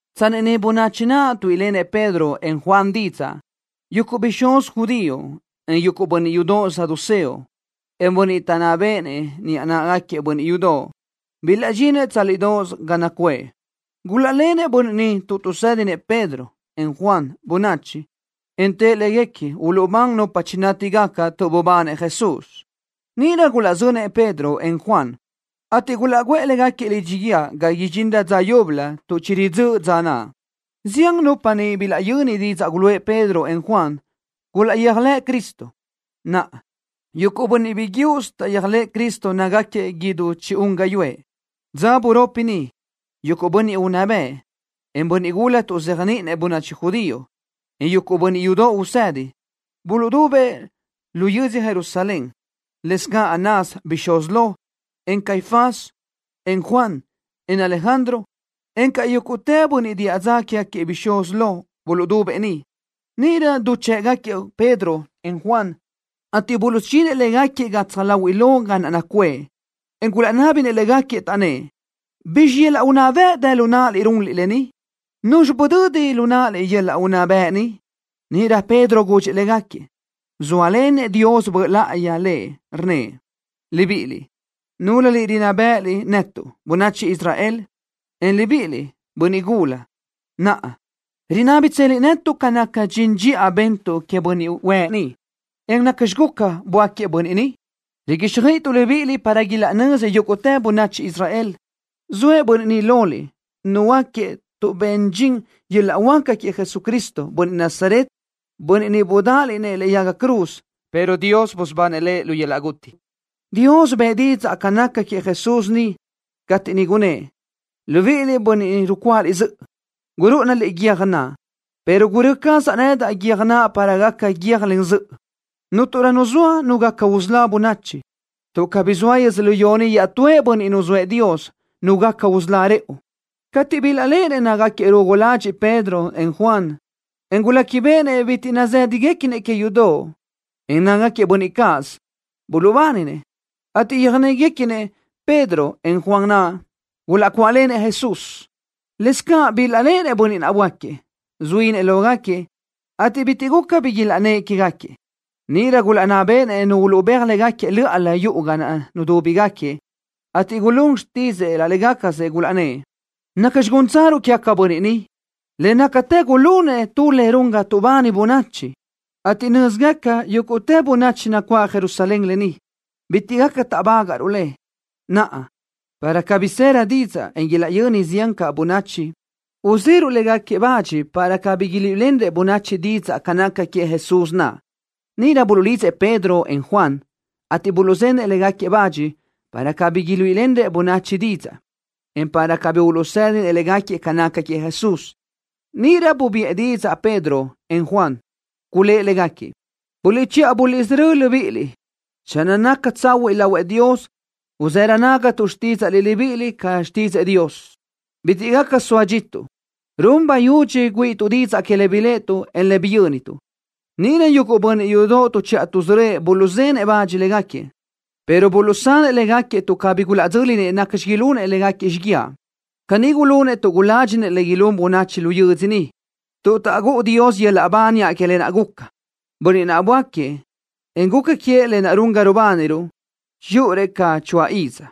Tsanni niʼ bönachi naʼ tuíʼilenëʼ Pedro, en Juan, didzaʼ, yuguʼ bixúz judío, en yuguʼ bönniʼ yudoʼ saduceo, en bönniʼ taʼnná béʼenëʼ niʼa náʼagaquiëʼ bönniʼ yudoʼ, bilaʼdxinëʼ tsálidoʼos ga naʼ nacuʼë. Gulaʼlenëʼ bönniʼ ni tuʼ tuʼsédinëʼ Pedro, en Juan, bönachi, en tëʼ léguequi uluʼbán nupa chinátigaca tuʼ bubanëʼ Jesús. Níʼirö gulaʼzönëʼ Pedro, en Juan, ateʼ gulaʼguʼë légaquiëʼ lidxi guíë ga idxinrö dza yúbölö tuʼ chiridzö́ʼ dza naʼ. Zián nupa niʼ bilaʼyöni didzaʼ guluʼë Pedro, en Juan, gulaʼyéajlëʼ Cristo. Naʼa, yuguʼ bönniʼ biguiúʼsö taʼyéajlëʼë Cristo nácagaquiëʼ idú chi-un gáyuʼë. Dza buropi niʼ, yuguʼ bönniʼ unná bëʼ, en bönniʼ gula tuʼzéajniʼinëʼ bönachi judío, en yuguʼ bönniʼ yudoʼ usëdi, buluʼdubëʼ lu yödzö Jerusalén. Lëscaʼ Anás, bixúz lo, en Caifás, en Juan, en Alejandro, encaʼ yúguʼtë bönniʼ diʼa dza quégaquiëʼ bixúz lo buluʼdubëʼ niʼ. Níʼirö duchë́ʼgaquiëʼ Pedro, en Juan, ateʼ buluʼsudxinëʼ légaquiëʼ gatsaj láhuiʼlö ga naʼ nacuʼë, en gulaʼnábinëʼ légaquiëʼ, taʼnnë́ʼ: —¿Bizxi yöl-laʼ unná bëʼ dë lu náʼaliʼ runliʼ lë ni? ¿Nuzxi budödi lu náʼaliʼ yöl-laʼ unná bëʼ ni? Níʼirö Pedro gudxëʼ légaquiëʼ, zóalenëʼ Dios Böʼ Láʼayi lëʼ, rnnëʼ: —Libiʼiliʼ, núlöliʼ rinná béʼeliʼ netuʼ, bönachi Israel, en libíʼiliʼ, bönniʼ gula. Naʼa, ¿rinábitseliʼ netuʼ ca naca dxin dxiʼa bentuʼ queëʼ bönniʼ huëʼ ni, en nacxi guca, böáquiëʼ bönniʼ ni? Riguíxjöiʼituʼ libíʼiliʼ para ilaʼnözi yúguʼtë bönachi Israel. Zoëʼ bönniʼ ni loliʼ, nuhuöáquiëʼ tuʼ ben dxin yöl-laʼ huáca queëʼ Jesucristo, bönniʼ Nazaret, Bönniʼ niʼ budáʼaliʼ-nëʼ lëʼe yaga cruz, pero Dios busubanëʼ Lëʼ lu yöl-laʼ guti. Dios bëʼë didzaʼ ca naca queëʼ Jesús ni, cateʼ niʼ gunnë́ʼ: “Libíʼiliʼ, bönniʼ rucuáʼaliʼ zöʼö, gurúʼunaliʼ guiö́j naʼ, pero gurö́ cazaʼ nedaʼ guiö́j naʼ para gaca guiö́jlen zöʼö.” Cúnturö nu zoa nu gaca usölá bönachi, tuʼ cabí zoa yödzölió ni iaʼtúëʼ bönniʼ nuzóëʼ Dios, nu gaca usölá rëʼu. Cateʼ bilaʼléʼenëʼ nácagaquiëʼ rugu ladxiʼ Pedro, en Juan, en guléquibeʼenëʼ bitiʼ nazë́dagaquiëʼ que yudoʼ, en nácagaquiëʼ bönniʼ cáʼasö, buluʼbáninëʼ, ateʼ yöjnéguequinëʼ Pedro, en Juan naʼ, gulaʼcuáʼlenëʼ Jesús. Lëscaʼ bilaʼléʼenëʼ bönniʼ naʼ böáquiëʼ, zuínëʼ lógaquiëʼ, ateʼ bitiʼ guca bi ilaʼnnë́ʼ quégaquiëʼ. Níʼirö gulaʼnná béʼenëʼ nupa uluʼbéaj légaquiëʼ lö́ʼalö yuʼu ga naʼ nudúbigaquiëʼ, ateʼ gulún xtidzëʼë laʼ légacasëʼ. Gulaʼnnë́ʼ: —¿Nacxi gúntsaruʼ quégaquiëʼ bönniʼ ni? Le nácatë gulunëʼ tu le run ga tuʼbani bönachi, ateʼ nö́zigaca yúguʼtë bönachi nacuáʼ Jerusalén lë ni. Bitiʼ gaca táʼbagaʼruʼ le. Naʼa, para cabí sërö didzaʼ, en ilaʼyöni ziánrö caʼ bönachi, uzeruʼ bach légaquiëʼ para cabí iluíʼilenrëʼ bönachi didzaʼ ca naca queëʼ Jesús naʼ. Níʼirö buluʼlidzëʼ Pedro, en Juan, ateʼ buluʼzenëʼ bach légaquiëʼ para cabí iluíʼilenrëʼ bönachi didzaʼ, en para cabí uluʼsédinëʼ légaquiëʼ ca naca queëʼ Jesús. Níʼirö buluʼbiʼë didzaʼ Pedro, en Juan. Gulë́ʼ légaquiëʼ: —Buliʼchiʼa buliʼsörö́ libíʼiliʼ channö naca tsahuiʼ lahuëʼ Dios uzërö nágatuʼ xtídzaʼliʼ libíʼiliʼ ca xtídzëʼë Dios. ¡Bitiʼ gaca soa dxituʼ! ¡Run bayudxi güíʼituʼ didzaʼ que le biléʼetuʼ, en le biyö́nituʼ! Níʼirö yuguʼ bönniʼ yudoʼ tuʼchiʼa tuʼsörö́ëʼ buluʼzenëʼ bach légaquiëʼ, pero buluʼsanëʼ légaquiëʼ tuʼ cabí gulaʼdzö́linëʼ nacxi ilunëʼ légaquiëʼ xíguiaʼ. Caní gulunëʼ tuʼ guládxinëʼ le ilún bönachi lu yödzö niʼ, tuʼ taʼgúʼu Dios yöl-laʼ ba niʼa que lë naʼ guca. Bönniʼ naʼ böáquiëʼ, en guca queëʼ lë naʼ run ga rubániruʼ, chiyúʼurëʼ ca choáʼ iz.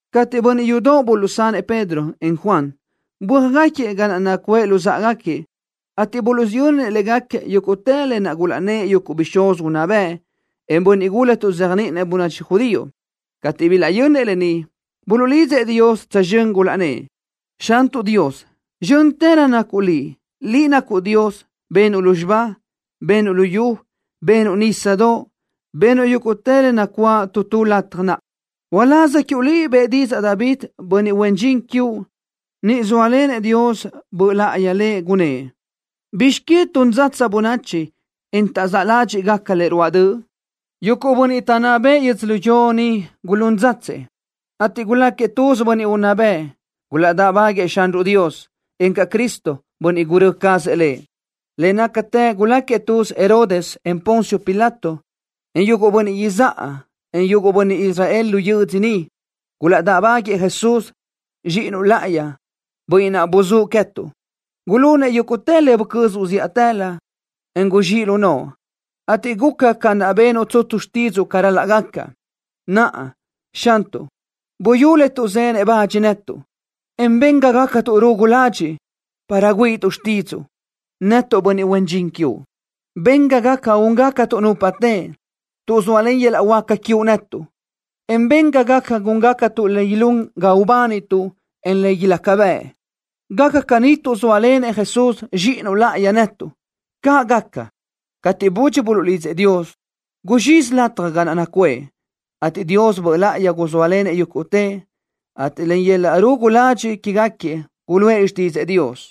Cateʼ bönniʼ yudoʼ buluʼsanëʼ Pedro, en Juan, bö́ajgaquiëʼ ga naʼ nacuʼë luzáʼagaquiëʼ, ateʼ buluʼsiyönnëʼ légaquiëʼ yúguʼtë lë naʼ gulaʼnnë́ʼ yuguʼ bixúz unná bëʼ, en bönniʼ gula tuʼzéajniʼinëʼ bönachi judío. Cateʼ bilaʼyönnëʼ lë ni, buluʼlidzëʼ Dios tsözxö́n, gulaʼnnë́ʼ: —Xantuʼ Dios, ¡zxö́ntërö nacuʼ Liʼ! ¡Liʼ nacuʼ Dios! ¡Benuʼ lúzxiba! ¡Benuʼ luyú! ¡Benuʼ nísadoʼ! ¡Benuʼ yúguʼtë le nacuáʼ tu tu lataj naʼ! Uláz quiuʼ Liʼ bëʼë didzaʼ David, bönniʼ huen dxin quiuʼ, niʼ zóalenëʼ Dios Böʼ Láʼayi lëʼ, gunnë́ʼ: ¿Bizx que tun dzatsa bönachi, en taʼzáʼ ládxiʼgaca le ruáʼ döʼ? Yuguʼ bönniʼ taʼnná bëʼë yödzölió ni gulún dzatsëʼ, ateʼ guláquiëʼ tuz bönniʼ unná bëʼ. Gulaʼdáʼbáguëʼë Xanruʼ Dios, encaʼ Cristo, bönniʼ gurö́ cazëʼ Lëʼ. ’Le nácatë guláquiëʼ tuz Herodes, en Poncio Pilato, en yuguʼ bönniʼ izáʼa, en yuguʼ bönniʼ Israel lu yödzö ni. Gulaʼdáʼbáguëʼë Jesús, Zxíʼinuʼ láʼayi, Bönniʼ naʼ buzúʼ queë́tuʼ. Gulunëʼ yúguʼtë le bucözuʼ zíʼatëlö, en guzxíʼ lu noʼo, ateʼ guca ca naʼ benuʼ tsutsu xtídzuʼu ca ral-laʼ gaca. Naʼa, Xantuʼ, buyú le tuʼzenëʼ bach netuʼ, en ben ga gácatuʼ rugu ladxiʼ, para güíʼituʼ xtídzuʼu, netuʼ bönniʼ huen dxin quiuʼ. Ben ga gaca úngacatuʼ nupa teʼe, tuʼ sóalen yöl-laʼ huáca quiuʼ netuʼ, en ben ga gaca gúngacatuʼ le ilún ga ubánituʼ, en le ilaca bëʼ. Gaca caní tuʼ zóalenëʼ Jesús, Zxíʼinuʼ láʼayi, netuʼ. ¡Caʼ gaca! Cateʼ budxi buluʼlidzëʼ Dios, guzxizi lataj ga naʼ nacuʼë, ateʼ Dios Böʼ Láʼayi guzóalenëʼ yúguʼtëʼ, ateʼ len yöl-laʼ rugu ladxiʼ quégaquiëʼ guluʼë xtídzëʼë Dios.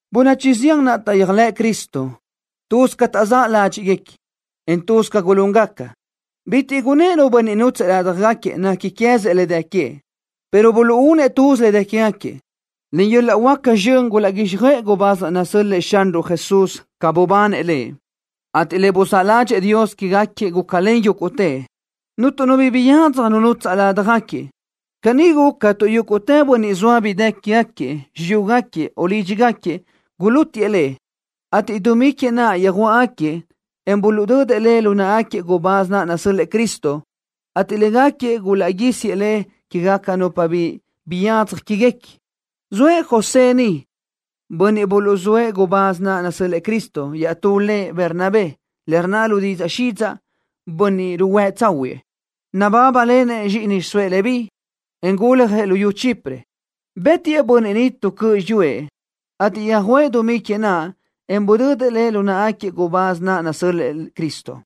Bönachi zián naʼ taʼyéajlëʼ Cristo, tuz ca taʼzáʼ ládxiʼguequi, en tuz ca gulúngaca. Bitiʼ gunnë́ʼ nu bönniʼ nútsëʼë ládjagaquiëʼ nequi queë́zëʼ le dë queëʼ, pero buluʼúnëʼ tuz le dë quégaquiëʼ. Len yöl-laʼ huáca zxön gulaʼguíxjöʼë gubáz naʼ nasö́l-lëʼë Xanruʼ Jesús ca bubanëʼ Lëʼ, ateʼ le buzáʼ ládxëʼë Dios quégaquiëʼ gúcalen yúguʼtëʼ. Cuntu nu bi biyadzaj nu nutsaʼ ládjagaquiëʼ. Caní guca tuʼ yúguʼtë bönniʼ zoa bi dë quégaquiëʼ, xiyúgaquiëʼ, o lídxigaquiëʼ, gulútiʼë le, ateʼ dumí que naʼ yöjuáʼgaquiëʼ, en buluʼdödëʼ le lu náʼagaquiëʼ gubáz naʼ nasö́l-lëʼë Cristo, ateʼ légaquiëʼ gulaʼguísiëʼ le que queë́gaca nupa bi biyadzaj quéguequi. Zoëʼ José niʼ, bönniʼ buluʼzóëʼ gubáz naʼ nasö́l-lëʼë Cristo iaʼtú lëʼ Bernabé, le rnna lu didzaʼ xidzaʼ, Bönniʼ Ruhuë́ Tsáhuëʼë. Nabábalenëʼ zxíʼini xiʼsóëʼ Leví, en guljëʼ luyú Chipre. Bë́tiʼë bönniʼ ni tu cöʼ xiyúëʼ, ateʼ yöjuʼë dumí que naʼ, en budödëʼ le lu náʼagaquiëʼ gubáz naʼ nasö́l-lëʼë Cristo.